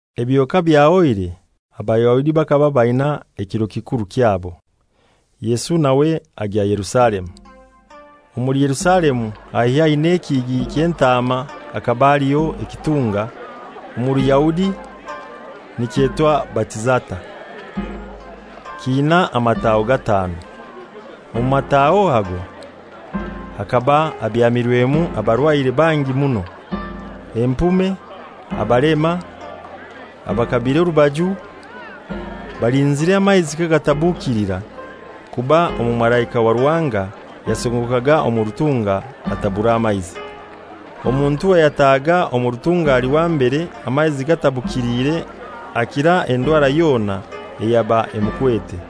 Ebyo kabyahoire Abayahudi bakaba baina ekiro kikuru kyabo, Yesu nawe agya Yerusalemu. Omuli Yerusalemu haihi n'Ekihigi ky'Entaama bhakaba haliho ekitunga, omu Ruyahudi nikyetwa Betizata, kiina amataho gatanu. Omu mataaho ago bhakaba habyamirwemu abarwaire bangi muno: Empume, abalema, abakabire orubaju, [balinzire amaizi kagatabukilira; kuba omumalaika wa Ruhanga yasongokaga omu rutunga, atabura amaizi. Omuntu ayatahaga omu rutunga ali wa mbere amaizi gatabukiliire akira endwara yona eyaba emukwete.]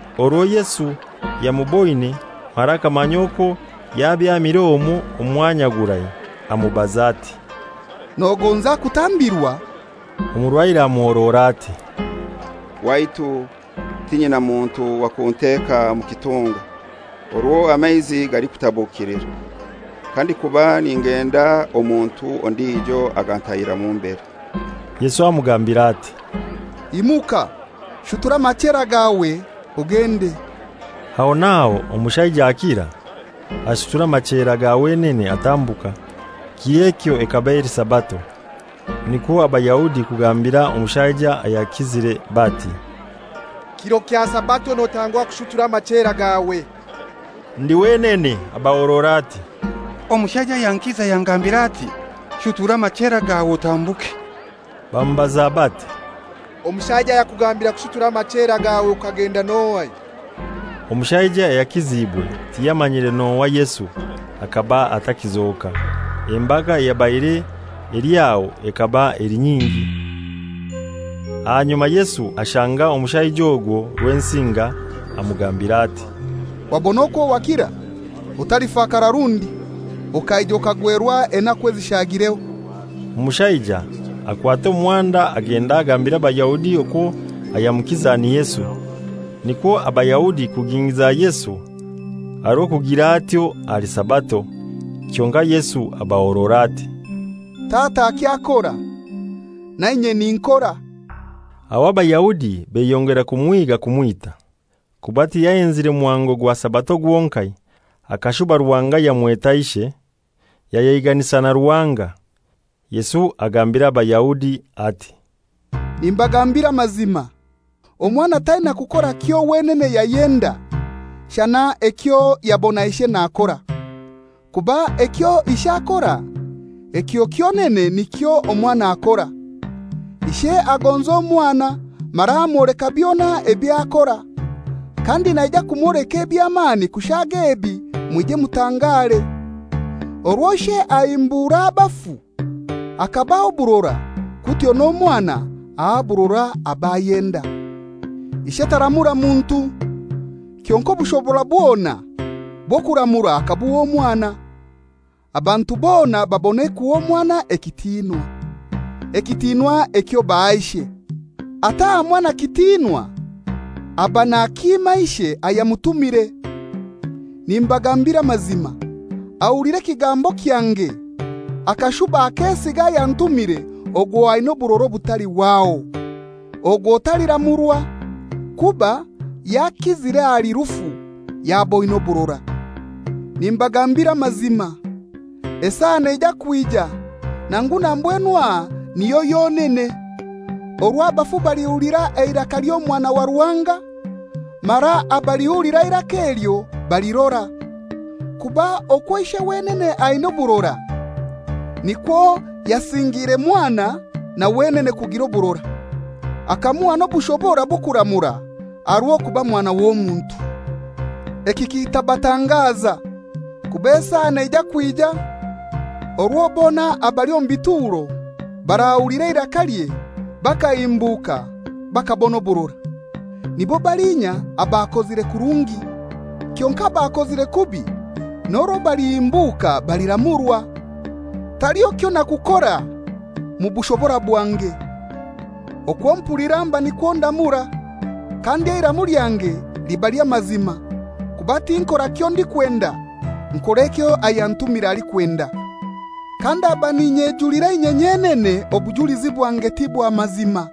Orwo Yesu yamuboine mara akamanya okwo yabyamire omwo omwanya gurai, amubaza ati, «Nogonza kutambirwa?» Omurwaire amuhorora ati, «Waitu, tinyina muntu wa kunteeka mu kitunga orwo amaizi galikutabukilira; kandikuba ningenda omuntu ondijo agantahiramu mbere.» Yesu amugambira ati, «Imuka, shutura amachera gawe, ogende.» Aho n'aho omushaija akira, ashutura amachera ga wenene atambuka. Kir'ekyo ekaba eli Sabato. Nikwo Abayahudi kugambira omushaija ayakizire bati, «Kiro kya Sabato; notangwa kushutura amachera gawe.» Ndi wenene abahorora ati, «Omushaija ayankiza yangambira ati, ‹Shutura amachera gawe otambuke.›» Bamubaza bati, «Omushaija ayakugambira kushutura amachera gawe okagenda n'ohai?» Omushaija ayakiziibwe tiyamanyire n'ohai Yesu hakaba atakizoka, embaga eyabaire eli aho ekaba eli nyingi. Ahanyuma Yesu ashanga omushaija ogwo Rwensinga, amugambira ati, «Wabona okwo wakira! Otalifakara rundi okaija okagwerwa enaku ezishaagireho.» Omushaija akwata omuhanda agenda agambira Abayahudi okwo ayamukiza ni Yesu. Nikwo Abayahudi kugingiiza Yesu aha rw'okugira atyo ahali Sabato. Kyonkai Yesu abahorora ati, «Tata akyakora, na inye ninkora.» Aho Abayahudi beyongera kumuhiiga kumwita, kuba tiyahenzire muhango gwa Sabato gwonkai, akashuba Ruhanga yamweta Ishe, yayeiganisa na Ruhanga. Yesu agambira Abayahudi ati, «Nimbagambira amazima, Omwana taina kukora kyo wenene yayenda, shana ekyo yabona Ishe nakora. Kuba ekyo Ishe akora, ekyo kyonene nikyo Omwana akora. Ishe agonza Omwana mara amwoleka byona ebyo akora. Kandi naija kumwoleka eby'amani kushaaga ebi mwije mutangare. Orwo Ishe ahimbura abafu hakabaha oburora, kutyo n'Omwana aha oburora ab'ayenda. Ishe taramura muntu, kyonkai obushobora bwona bw'okuramura akabuha Omwana, abantu bona babone kuha Omwana ekitinwa, ekitinwa ekyo baha Ishe. Ataha Mwana kitinwa aba nakiima Ishe ayamutumire. Nimbagambira amazima, ahulira ekigambo kyange akashuba akesiga ayantumire ogwo aina oburora obutalihwaho. Ogwo taliramurwa, kuba yakizire ahali rufu, yaboine oburora. «Nimbagambira amazima, esaa neija kwija, nangu na mbwenu aha niyo yonene, orwo abafu balihulira eiraka ly'Omwana wa Ruhanga, mara abalihulira eiraka elyo balirora. Kuba okwo Ishe wenene aina oburora, nikwo yasingiire Mwana na wenene kugira oburora, akamuha n'obushobora bw'okuramura, aha rw'okuba Mwana w'Omuntu. Eki kitabatangaza; kuba esaa neija kwija orwo bona abali omu bituro barahulira eirakalye bakahimbuka bakabona oburora, nibo baliinya abakozire kurungi. Kyonkai abakozire kubi n'orwo balihimbuka baliramurwa. «Taliho kyonakukora mu bushobora bwange. Okwo mpulira mba nikwo ndamura. Kandi eiramu lyange liba ly'amazima; kuba tinkora kyondikwenda, nkora ekyo ayantumire alikwenda. Kandaba n'inyejulira inye nyenene obujulizi bwange ti bwa mazima.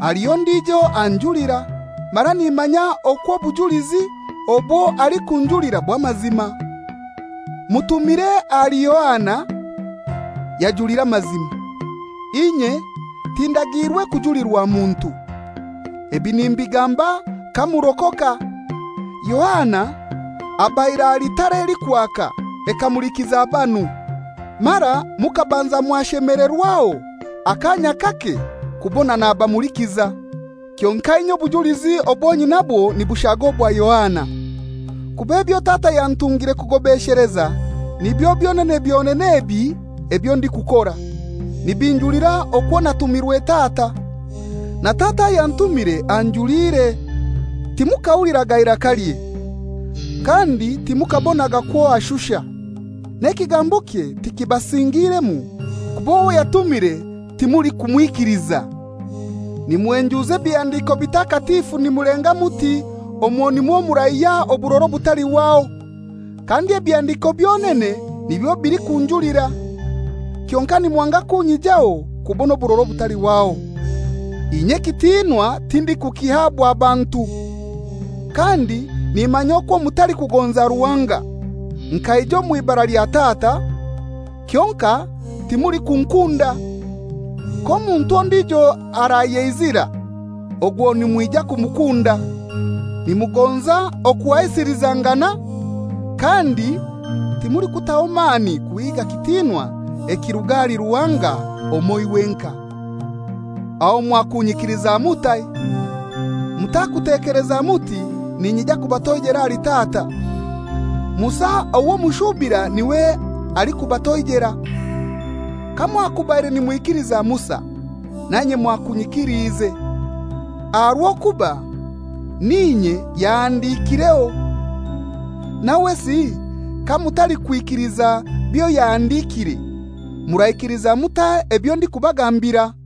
Haliho ondijo anjulira, mara nimanya okwo obujulizi obwo alikunjulira bw'amazima. Mutumire ahali Yohana, yajulira amazima. Inye tindagiirwe kujulirwa muntu; ebi nimbigamba kamurokoka. Yohana abaire ali tara elikwaka, ekamulikiza banu. Mara mukabanza mwashemelerwaho akaanya kake kubona nabamulikiza. Kyonkai inye obujulizi obwo nyinabwo nibushaga obwa Yohana, kuba ebyo Tata yantungire kugobesheleza, nibyo byonene byonene ebi ebyo ndikukora, nibinjulira okwo natumirwe Tata. Na Tata ayantumire anjuliire. Timukahuliraga irakalye, kandi timukabonaga kwo ashusha. N'ekigambokye tikibasingiiremu, kuba owo yatumire timulikumwikiliza. Nimuhenjuuza Ebihandiko Bitakatifu nimulenga muti omwo nimwo muraihya oburora obutalihwaho; kandi Ebihandiko byonene nibyo bilikunjulira. Kyonkai nimwanga kunyijaho kubona oburora obutalihwaho. Inye ekitinwa tindikukihabwa bantu. Kandi nimanya okwo mutalikugonza Ruhanga. Nkaija omw'ibara lya Tata, kyonkai timulikunkunda. K'omuntu ondijo arayeizira, ogwo nimwija kumukunda. Nimugonza okuhaisilizangana, kandi timulikutaho mani kuhiiga kitinwa ekiruga ahali Ruhanga omoi wenkai, aho mwakunyikiliza mutai? Mutakutekeleza muti ninyija kubatoijela ahali Tata. Musa owo mushuubira n'iwe alikubatoijera. Kamwakubaire nimwikiliza Musa, nanye mwakunyikiliize, aha rw'okuba n'inye yahandikiireho. Nawesi kamutalikwikiliza byo yahandikiire, muraikiliza mutai ebyo ndikubagambira?»